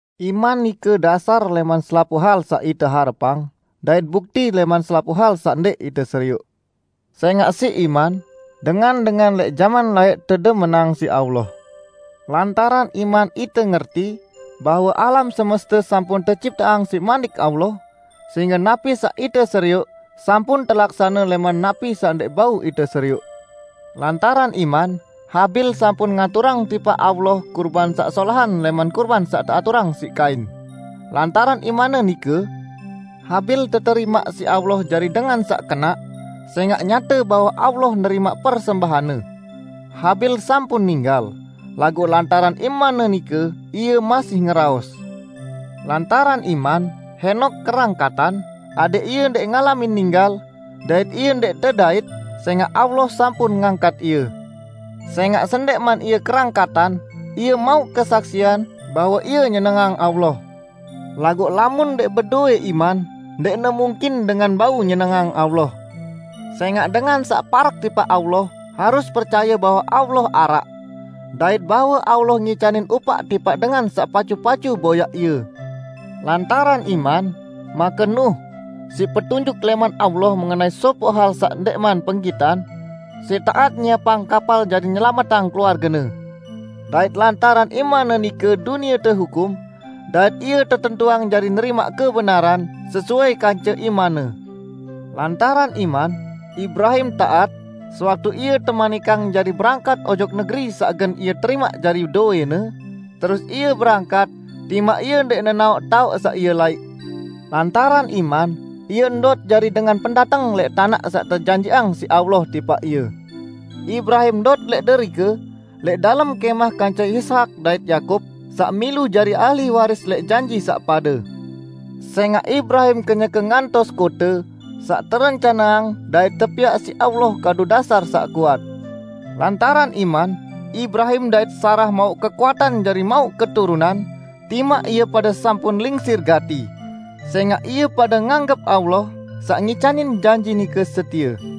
Iman nike dasar lẽman selapuq hal saq ite harepang dait bukti lẽman selapuq hal saq ndẽq ite serioq. Sẽngaq siq iman, dengan-dengan lẽq jaman laẽq tedemenang siq Allah. Lantaran iman ite ngerti, bahwe alam semeste sampun tecipteang siq Manik Allah, sehingge napi saq ite serioq sampun telaksane lẽman napi saq ndẽq bau ite serioq. Lantaran iman Habil sampun ngaturang tipaq Allah kurban saq solahan lẽman kurban saq teaturang siq Kain. Lantaran imanne nike, Habil teterimaq siq Allah jari dengan saq kenaq, sẽngaq nyate bahwe Allah nerimaq persembahanne. Habil sampun ninggal, laguq lantaran imanne nike, ie masih ngeraos. Lantaran iman Henok kerangkatan, adẽq ie ndẽq ngalamin ninggal, dait ie ndẽq tedait, sẽngaq Allah sampun ngangkat ie. Sẽngaq sendẽqman ie kerangkatan, ie mauq kesaksian, bahwe ie nyenengang Allah. Laguq lamun ndẽq bedowẽ iman ndẽqne mungkin dengan bau nyenengang Allah. Sẽngaq dengan saq parek tipaq Allah harus percaye bahwe Allah araq, dait bahwe Allah ngicanin upaq tipaq dengan saq pacu-pacu boyaq Ie. Lantaran iman, make Nuh -- siq petunjuk lẽman Allah mengenai sopoq hal saq ndẽqman penggitan -- siq taat nyiepang kapal jari nyelametang keluargene; dait lantaran imanne nike dunie tehukum dait ie tetentuang jari nerimaq kebenaran, sesuai kance imanne. Lantaran iman Ibrahim taat, sewaktu ie temanikang jari berangkat ojok negeri saq gen ie terimaq jari dowẽne, terus ie berangkat timaq ie ndẽq nenaoq taoq saq ie laiq. Lantaran iman ie ndot jari dengan pendateng lẽq tanaq saq tejanjiqang siq Allah tipaq ie. Ibrahim ndot lẽq derike lẽq dalem kẽmah kance Ishak dait Yakub, saq milu jari ahli waris lẽq janji saq pade. Sẽngaq Ibrahim kenyeke ngantos kote saq terencaneang dait tepiaq siq Allah kadu dasar saq kuat. Lantaran iman Ibrahim dait Sarah mauq kekuatan jari mauq keturunan, timaq ie pade sampun lingsir gati, sẽngaq ie pade nganggep Allah, saq ngicanin janji nike setie.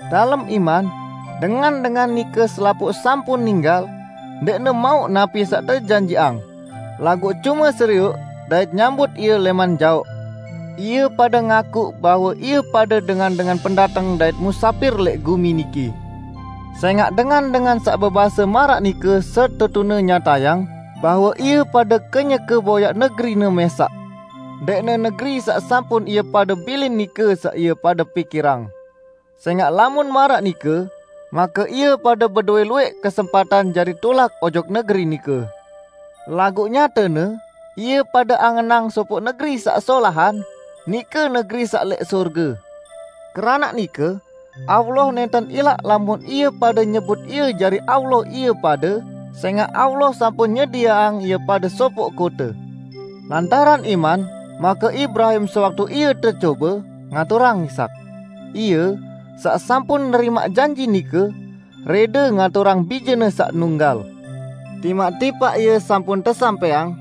Dalem iman, dengan-dengan nike selapuq sampun ninggal ndẽqne mauq napi saq tejanjiqang, laguq cume serioq dait nyambut ie lẽman jaoq. Ie pade ngakuq bahwe ie pade dengan-dengan pendateng dait musapir lẽq gumi niki. Sẽngaq dengan-dengan saq bebase maraq nike setetune nyatayang bahwe ie pade kenyeke boyaq negerine mẽsaq. Ndẽqne negeri saq sampun ie pade bilin nike saq ie pade pikirang. Sẽngaq lamun maraq nike, make ie pade bedowẽ luwẽq kesempatan jari tulak ojok negeri nike. Laguq nyatene, ie pade angenang sopoq negeri saq solahan, nike negeri saq lẽq sorge. Keranaq nike Allah nẽnten ilaq lamun ie pade nyebut Ie jari Allah ie pade, sẽngaq Allah sampun nyedieang ie pade sopoq kote. Lantaran iman make Ibrahim, sewaktu ie tecobe, ngaturang Ishak. Ie, saq sampun nerimaq janji nike, rẽde ngaturang bijene saq nunggal. Timaq tipaq ie sampun tesampẽang: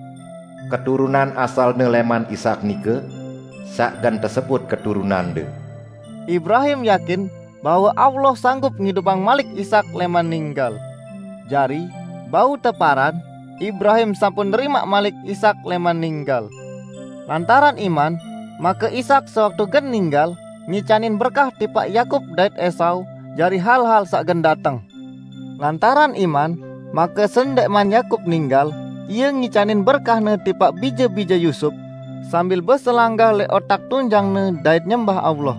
"Keturunan asalne lẽman Ishak nike saq gen tesebut keturunande." Ibrahim yakin bahwe Allah sanggup ngidupang malik Ishak lẽman ninggal -- jari, bau teparan, Ibrahim sampun nerimaq malik Ishak lẽman ninggal. Lantaran iman make Ishak, sewaktu gen ninggal, ngicanin berkah tipaq Yakub dait Esau jari hal-hal saq gen dateng. Lantaran iman, make sendẽqman Yakub ninggal, ie ngicanin berkahne tipaq bije-bije Yusup, sambil beselanggah lẽq otak tunjangne dait nyembah Allah.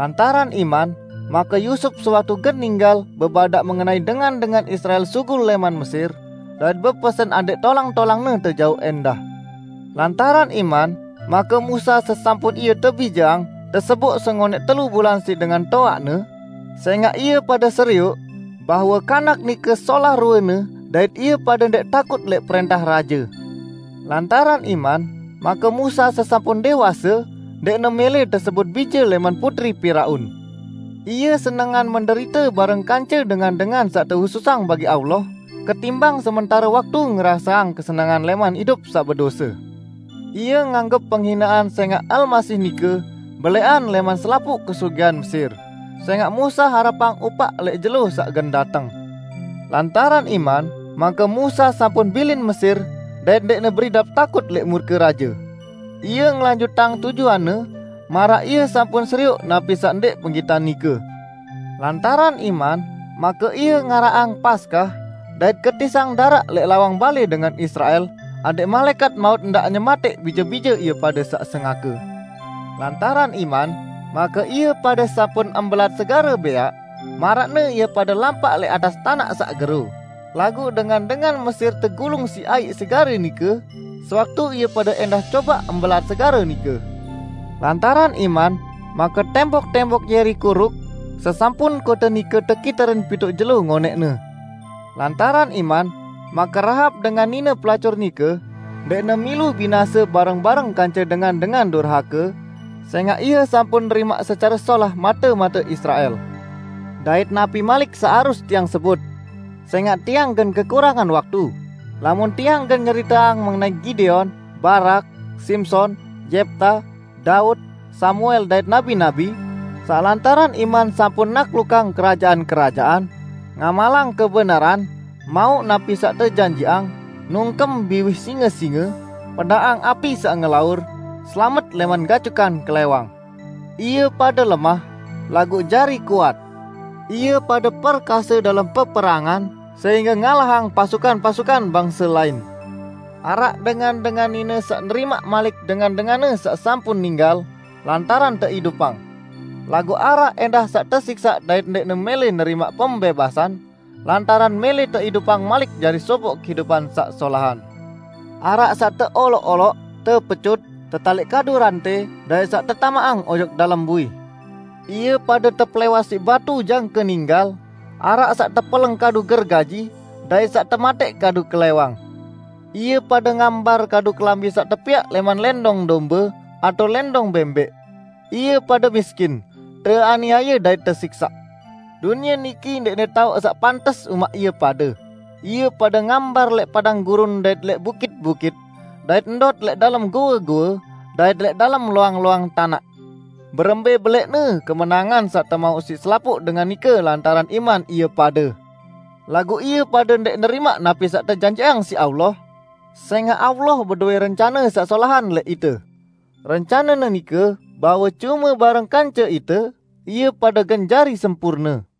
Lantaran iman, make Yusup sewaktu gen ninggal bebadaq mengenai dengan-dengan Israel sugul lẽman Mesir, dait bepesen adẽq tolang-tolangne tejauq ẽndah. Lantaran iman make Musa, sesampun ie tebijeang, teseboq sengonẽq telu bulan siq dengan toaqne, sẽngaq ie pade serioq, bahwe kanak nike solah ruene dait ie pade ndẽq takut lẽq prẽntah raje. Lantaran iman make Musa, sesampun dẽwase, ndẽqne mẽlẽ tesebut bije lẽman putri Piraun. Ie senengan menderite bareng kance dengan-dengan saq tehususang bagi Allah, ketimbang sementare waktu ngeraseang kesenengan lẽman idup saq bedose. Ie nganggep penghinean sẽngaq Almasih nike belẽqan lẽman selapuq kesugihan Mesir, sẽngaq Musa harepang upaq lẽq jelo saq gen dateng. Lantaran iman make Musa sampun bilin Mesir dait ndẽqne beridap takut lẽq murke raje. Ie ngelanjutang tujuanne maraq ie sampun serioq napi saq ndẽq penggitan nike. Lantaran iman make ie ngaraqang Paskah dait ketisang daraq lẽq lawang balẽ dengan Israel adẽq Malaẽkat Maut ndaq nyematẽq bije-bije ie pade saq sengake. Lantaran iman make ie pade sampun mbelat Segare Bẽaq, maraqne ie pade lampaq lẽq atas tanaq saq gero, laguq dengan-dengan Mesir tegulung siq aiq segare nike, sewaktu ie pade ẽndah cobaq mbelat segare nike. Lantaran iman make tembok-tembok Yeriko ruk, sesampun kote nike tekiterin pituq jelo ngonẽqne. Lantaran iman, make Rahab, dengan nine pelacur nike, ndẽqne milu binase bareng-bareng kance dengan-dengan durhake, sẽngaq ie sampun nerimaq secare solah mate-mate Israel. Dait napi malik saq harus tiang sebut? Sẽngaq tiang gen kekurangan waktu, lamun tiang gen nyeriteang mengenai Gideon, Barak, Simson, Yepta, Daud, Samuel dait nabi-nabi, saq lantaran iman sampun naklukang kerajaan-kerajaan, ngamalang kebenaran, mauq napi saq tejanjiqang, nungkem biwih singe-singe, pedaqang api saq ngelaur, selamet lẽman gacukan klẽwang. Ie pade lemah, laguq jari kuat; ie pade perkase dalem peperangan sehingge ngalahang pasukan-pasukan bangse lain. Araq dengan-dengan nine saq nerimaq malik dengan-denganne saq sampun ninggal, lantaran teidupang. Laguq araq ẽndah saq tesiksaq dait ndẽqne mẽlẽ nerimaq pembẽbasan, lantaran mẽlẽ teidupang malik jari sopoq kehidupan saq solahan. Araq saq teoloq-oloq, tepecut, tetaliq kadu rantẽ dait saq tetamaqang ojok dalem bui. Ie pade tepelẽwas siq batu jangke ninggal, araq saq tepeleng kadu gergaji, dait saq tematẽq kadu klẽwang. Ie pade ngambar kadu kelambi saq tepiaq lẽman lẽndong dombe atao lẽndong bẽmbẽq; ie pade miskin, teaniaye dait tesiksaq. Dunie niki ndẽqne taoq saq pantes umaq ie pade, ie pade ngambar lẽq padang gurun dait lẽq bukit-bukit, dait ndot lẽq dalem goe-goe dait lẽq dalem loang-loang tanaq. Berembẽ belẽqne kemenangan saq temauq siq selapuq dengan nike lantaran iman ie pade! Laguq ie pade ndẽq nerimaq napi saq tejanjiqang siq Allah, sẽngaq Allah bedowẽ rencane saq solahan lẽq ite. Rencane-Ne nike bahwe cume bareng kance ite, ie pade gen jari sempurne.